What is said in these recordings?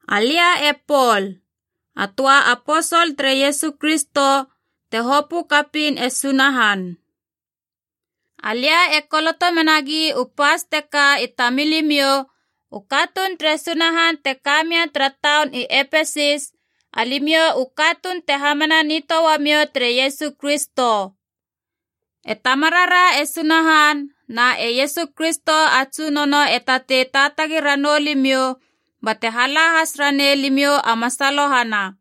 Alia e Pol, a töa aposol tere Iesu Kristo te hopö kapiin e Sunahan. Alia e koloto menagi u pas teka i tamilimiou u katuun tere Sunahan te ka mia tara taun i Epesis, alimiou u katuun te hamana nitöa uamiou tere Iesu Kristo. E Tamarara e Sunahan na e Iesu Kristo a Tsunono e tatei taatagi ranou limiou bate hala has ranei limiou a masalohana.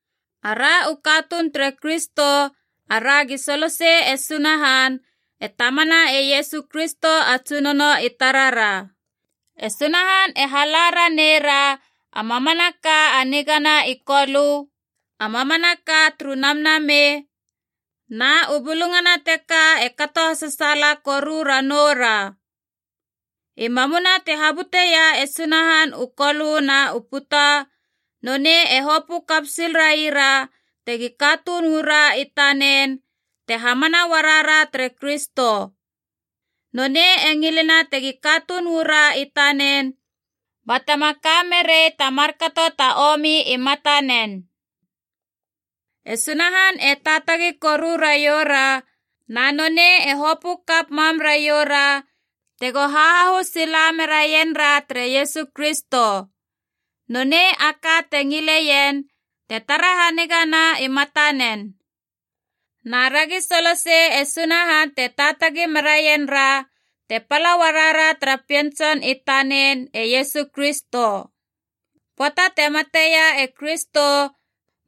Ara u katuun tere Kristo aragi solosei e Sunahan, e Tamana e Iesu Kristo a Tsunono i tarara. E Sunahan e hala ranei ra a mamanaka a nigana i Kolö, a mamanaka turu Namnamei, na u bulungana teka e kato hasasaala koru ranoura. I mamuma te habuteia e Sunahan u kolö na u puta, nonei e hopö kap sil raira tegi katuun uu ra i tanen, te hamana uarara tere Kristo. Nonei e ngilena tegi katuun uu ra i tanen batema ka merei ta markato ta omi i matanen. E Sunahan e taatagi koru raioura, na nonei e hopö kap mam raioura tego hahahu sila meraien ra tere Iesu Kristo. Nonei a ka te ngileien te tara hanigana i matanen. Na ragi solosei e Sunahan te taatagi meraien ra te pala uarara tara Pien Tson i tanen e Iesu Kristo. Pöata te mateia e Kristo,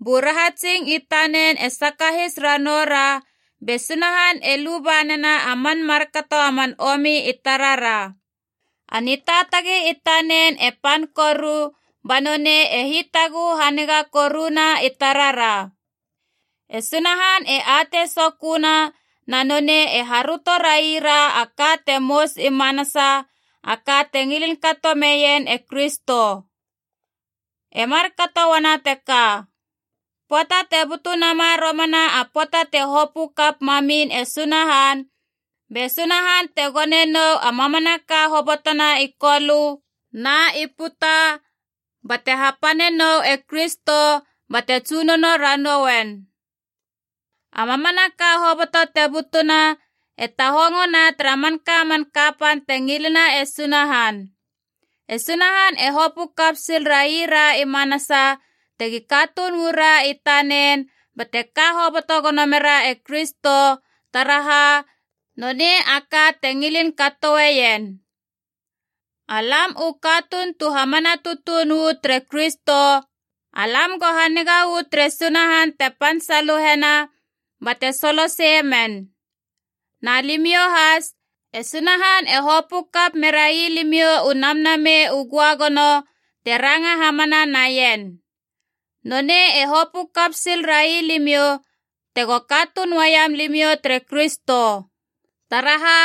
bu rahatsing i tanen e sakahis ranoura be Sunahan e luba nena a man markato a man omi i tarara. A nitaatagi i tanen e pan koru, ba nonei e hitaguhu haniga koruna i tarara. E Sunahan e atei soköna, na nonei e haröto raira a ka te mous i manasa, a ka te ngilin kato meien e Kristo. E markato uana teka: pöata te butu nama romana a pöata te hopö kap mamin e Sunahan, be Sunahan te gone nou a mamanaka hobotona i kolö na i puta bate hapane nou e Kristo bate tsunono ranou uen. A mamanaka hoboto te butuna e tahongona tara manka man kapan te ngilena e Sunahan. E Sunahan e hopö kap sil raira i manasa tegi katuun uu ra i tanen bate ka hoboto gono mera e Kristo, taraha nonei a ka te ngilin katoeien. Alam u katuun tu hamana tutuun uu tere Kristo, alam go haniga uu tere Sunahan te pan saluhena bate soloseie men. Na limiou has, e Sunahan e hopö kap merai limiou u Namnamei u Göagono te ranga hamana naien. Nonei e hopö kap sil railimiou tego katuun uaiam limiou tere Kristo. Taraha,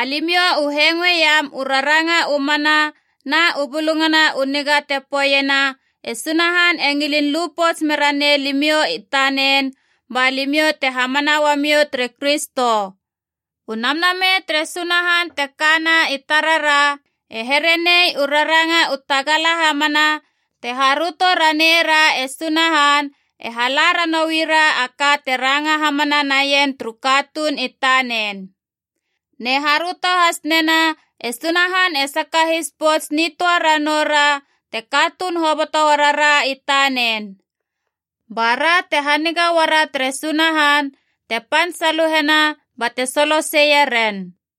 alimiou u hengoeiam u raranga u mana na u Bulungana u Niga te poeiena e Sunahan e ngilin lu pouts mera nei limiou i tanen, ba limiou te hamana uamiou tere Kristo. U Namnamei tere Sunahan te kana i tarara e here nei u raranga u tagala hamana te haröto raneira e Sunahan, e hala ranoui ra a ka te ranga hamana naien turu katuun i tanen. Ne haröto has nena e Sunahan e sakahis pouts nitöa ranoura te katuun hoboto uarara i tanen. Bara te haniga uara tere Sunahan te pan saluhena bate soloseie ren.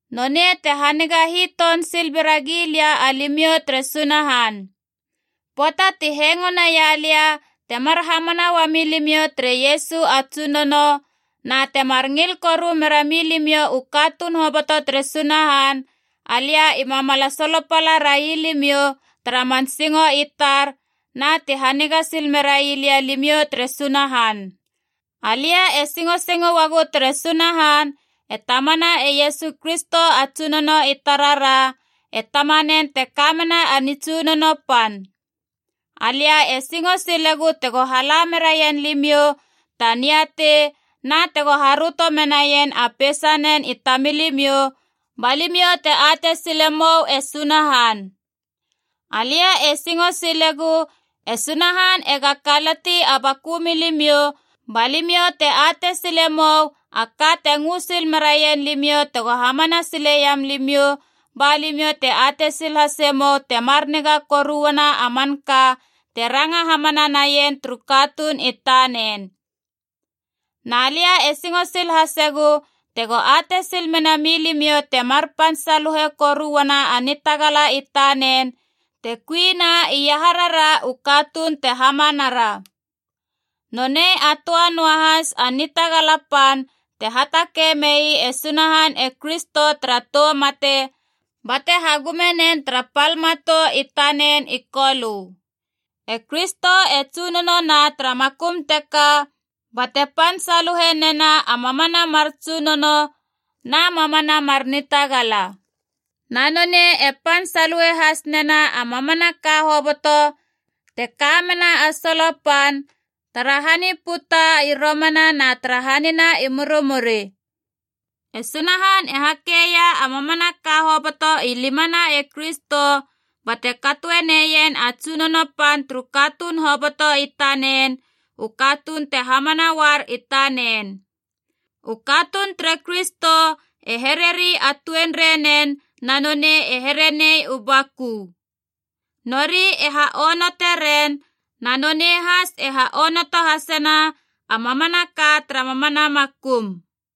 Nonei te haniga hiton sil bera gilia alimiou tere Sunahan. Pöata ti hengo naia lia temar hamana uami limiou tere Iesu a Tsunono, na temar ngil koru mera milimiou u katuun hoboto tere Sunahan, alia ima mala solopala railimiou tara man singo i tar na ti haniga sil merai lia alimiou tere Sunahan. Alia e singosingo uagu tere Sunahan e Tamana e Iesu Kristo a Tsunono i tarara, e Tamanen te ka mena a nitsunono pan. Alia e singo silegu tego hala meraien limiou ta niatei na tego haröto menaien a peisanen i tamilimiou, ba limiou te atei sile mou e Sunahan. Alia e singo silegu e Sunahan ega kalati a baku milimiou ba limiou te atei sile mou a ka te ngö sil meraien limiou tego hamana sileiam limiou, ba limiou te atei sil hase mou temar niga koru uana a manka te ranga hamana naien turu katuun i tanen. Na lia e singo sil hasegu tego atei sil mena milimiou temar pan saluhe koru uana a nitagala i tanen te kuina iaharara u katuun te hamanara. Nonei a töa noa lahas a nitagala pan te hatakei mei e Sunahan e Kristo tara tou mate bate hagume nen tara pal matou i tanen i Kolö. E Kristo e tsunono na tara makum teka bate pan saluhe nena a mamana mar tsunono na mamana mar nitagala. Na nonei e pan saluhe has nena a mamanaka hoboto te ka mena a solo pan, tara han i puta i romana na tara hanina i murimuri. E Sunahan e hakeia a mamanaka hoboto i limana e Kristo, bate katoe neien a tsunono pan turu katuun hoboto i tanen, u katuun te hamana uar i tanen. U katuun tere Kristo e hereri a tuenrei nen na nonei e here nei u baku. Nori e ha onote ren, na nonei has e ha onoto hasena a mamanaka tara mamana makum.